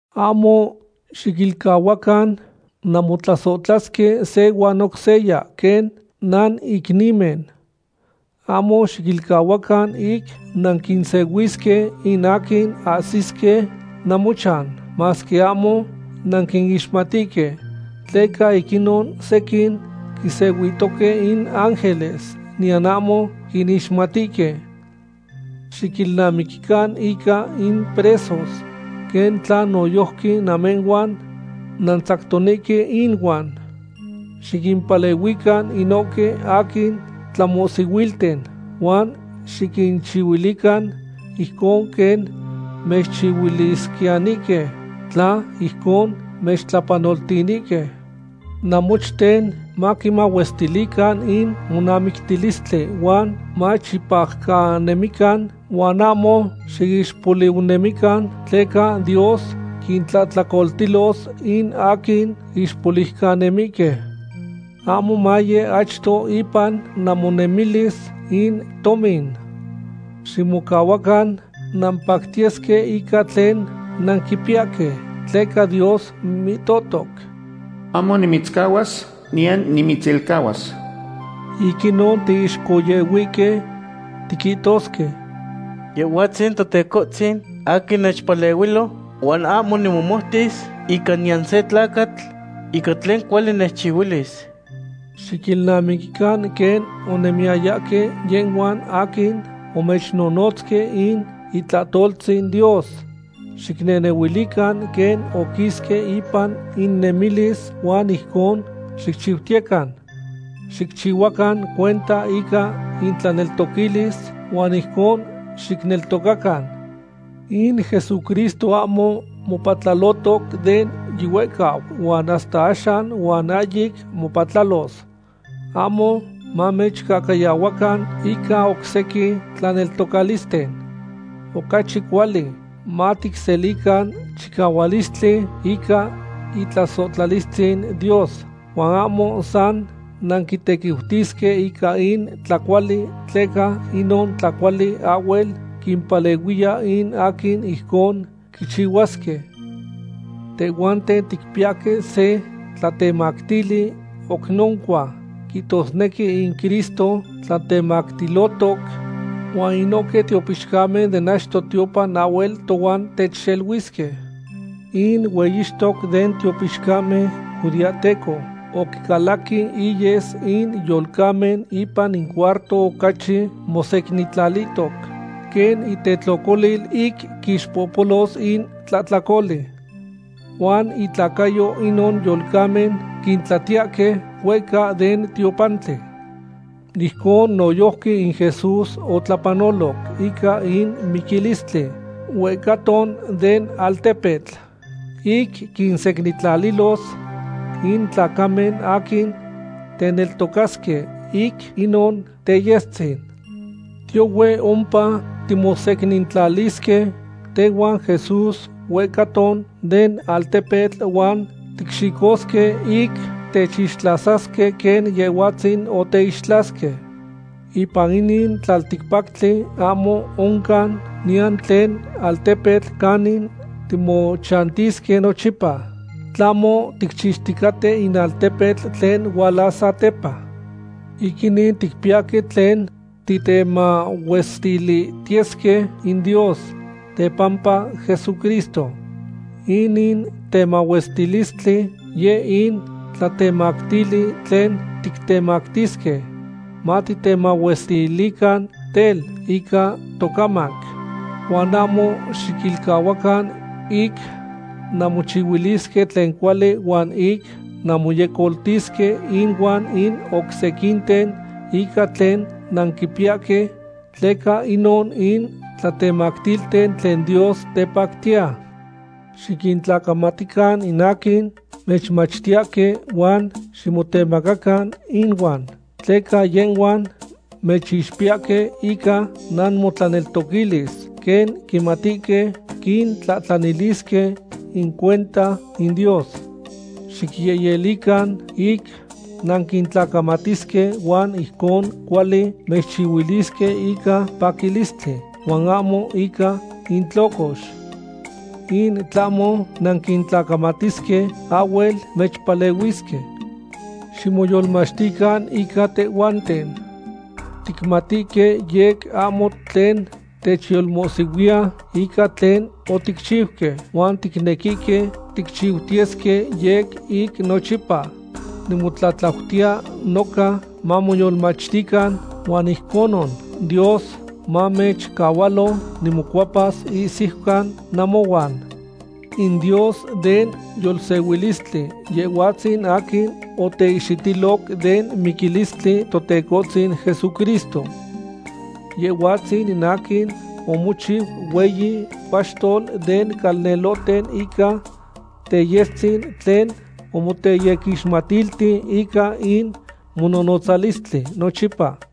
Ahmo xiquilcahuacan nanmotlasohtlasque se huan oc seya quen nanicnimen. Ahmo xiquilcahuacan ic nanquinsehuisque in aquin ahsisque namochan, masque ahmo nanquinixmatihque. Tleca ic inon sequin quinsehuihtoque in ángeles, niyan ahmo quinixmatihque. Xiquilnamiquican ica in presos, quen tla noyojqui namehhuan nantzactonihque inuan. Xiquimpalehuican inohque aquin tlamohsihuilten, huan xiquinchihuilican ijcon quen mechchihuilisquiyanihque tla ijcon mechtlapanoltinihque. Namochten maquimahuestilican in monamictilistli huan machipajcanemican huan ahmo xiixpoliucanemican, tleca Dios quintlahtlacoltilos in aquin ixpoliucanemihque. Ahmo maye achto ipan namonemilis in tomin. Ximocahuacan nampactiyesque ica tlen nanquipiyahque, tleca Dios mihtohtoc: “Ahmo nimitzcahuas, niyan nimitzilcahuas.” Ic inon tiixcohyehuihque tiquihtosque: Yehhuatzin Totecohtzin aquin nechpalehuilo, huan ahmo nimomoutis ica niyan se tlacatl ica tlen cuali nechchihuilis. Xiquilnamiquican quen onemiyayahque yehhuan aquin omechnonotzque in itlahtoltzin Dios. Xicnehnehuilican quen oquisque ipan innemilis huan ijcon xicchiutiyecan. Xicchihuacan cuenta ica intlaneltoquilis huan ijcon xicneltocacan. In Jesucristo ahmo mopatlalohtoc de yihuehcau huan hasta axan huan ahyic mopatlalos. Ahmo mamechcahcayahuacan ica oc sequin tlaneltocalisten. Ocachi cuali maticselican chicahualistli ica itlasohtlalistzin Dios, huan ahmo san nanquitequiutisque ica in tlacuali, tleca inon tlacuali ahhuel quimpalehuiya in aquin ijcon quichihuasque. Tehhuanten ticpiyahque se tlatemactili oc noncua, quihtosnequi in Cristo tlatemactilotoc, huan inohque tiopixcamen den achto tiopan ahhuel tohuan techxeluisque. In hueyixtoc den tiopixcamen judeahteco oquicalaqui iyes in yolcamen ipan in cuarto ocachi mosecnintlalihtoc, quen itetlocolil ic quixpohpolos in tlahtlacoli. Huan intlacayo inon yolcamen quintlatiyahque huehca den tiopantli. Ijcon noyojqui in Jesús otlapanoloc ica in miquilistli huehcaton den altepetl ic quinsecnintlalilos in tlacamen aquin teneltocasque ic inon teyestzin. Tiyohue ompa timosecnintlalisque tehuan Jesús huehcaton den altepetl huan ticxicosque ic techixtlasasque quen Yehhuatzin oteixtlasque. Ipan inin tlalticpactli ahmo oncan niyan tlen altepetl canin timochantisque nochipa, tlahmo ticchixticaten in altepetl tlen hualas satepa. Ic inin ticpiyahque tlen titemahuestilihtiyesque in Dios tepampa Jesucristo. Inin temahuestilistli yeh in tlatemactili tlen titemactisque. Matitemahuestilican tel, ica tocamac. Huan ahmo xiquilcahuacan ic nanmochihuilisque tlen cuali huan ic nanmoyecoltisque inuan in oc sequinten ica tlen nanquipiyahque, tleca inon in tlatemactilten tlen Dios tepactiya. Xiquintlacamatican in aquin mechmachtiyahque huan ximotemacacan inuan, tleca yehhuan mechixpiyahque ica namotlaneltoquilis, quen quimatihque quintlahtlanilisque in cuenta in Dios. Xicyehyelican ic nanquintlacamatisque huan ijcon cuali mechchihuilisque ica paquilistli huan ahmo ica intlocox. In tlahmo nanquintlacamatisque, ahhuel mechpalehuisque. Ximoyolmachtican ica tehhuanten. Ticmatihque yec ahmo tlen techyolmohsihuiya ica tlen oticchiuque, huan ticnequihque ticchiutiyesque yec ic nochipa. Nimotlatlautiya noca mamoyolmachtican, huan ijconon Dios manechcahualo nimocuepas ihsiucan namohuan. In Dios den yolsehuilistli, Yehhuatzin aquin oteihxitiloc den miquilistli Totecohtzin Jesucristo. Yehhuatzin in aquin omochiu hueyi paxtol den calnelohten ica teyestzin tlen omoteyequixmatilti ica in mononotzalistli nochipa.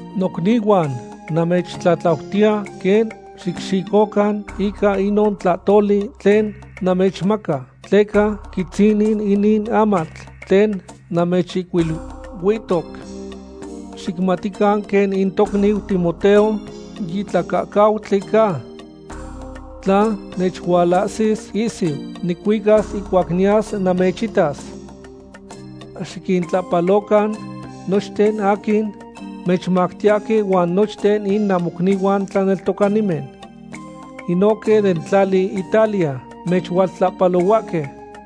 Nocnihuan, namechtlatlautiya quen xicxicocan ica inon tlahtoli tlen namechmaca, tleca quitzinin inin amatl tlen namechihcuiluihtoc. Xicmatican quen in tocniu Timoteo yitlacahcautli ca. Tla nechualahsis ihsiu, nicuicas ihcuac niyas namechitas. Xiquintlahpalocan nochten aquin mechmachtiyahque huan nochten in namocnihuan tlaneltocanimen. Inohque den tlali Italia mechualtlahpalohuahque.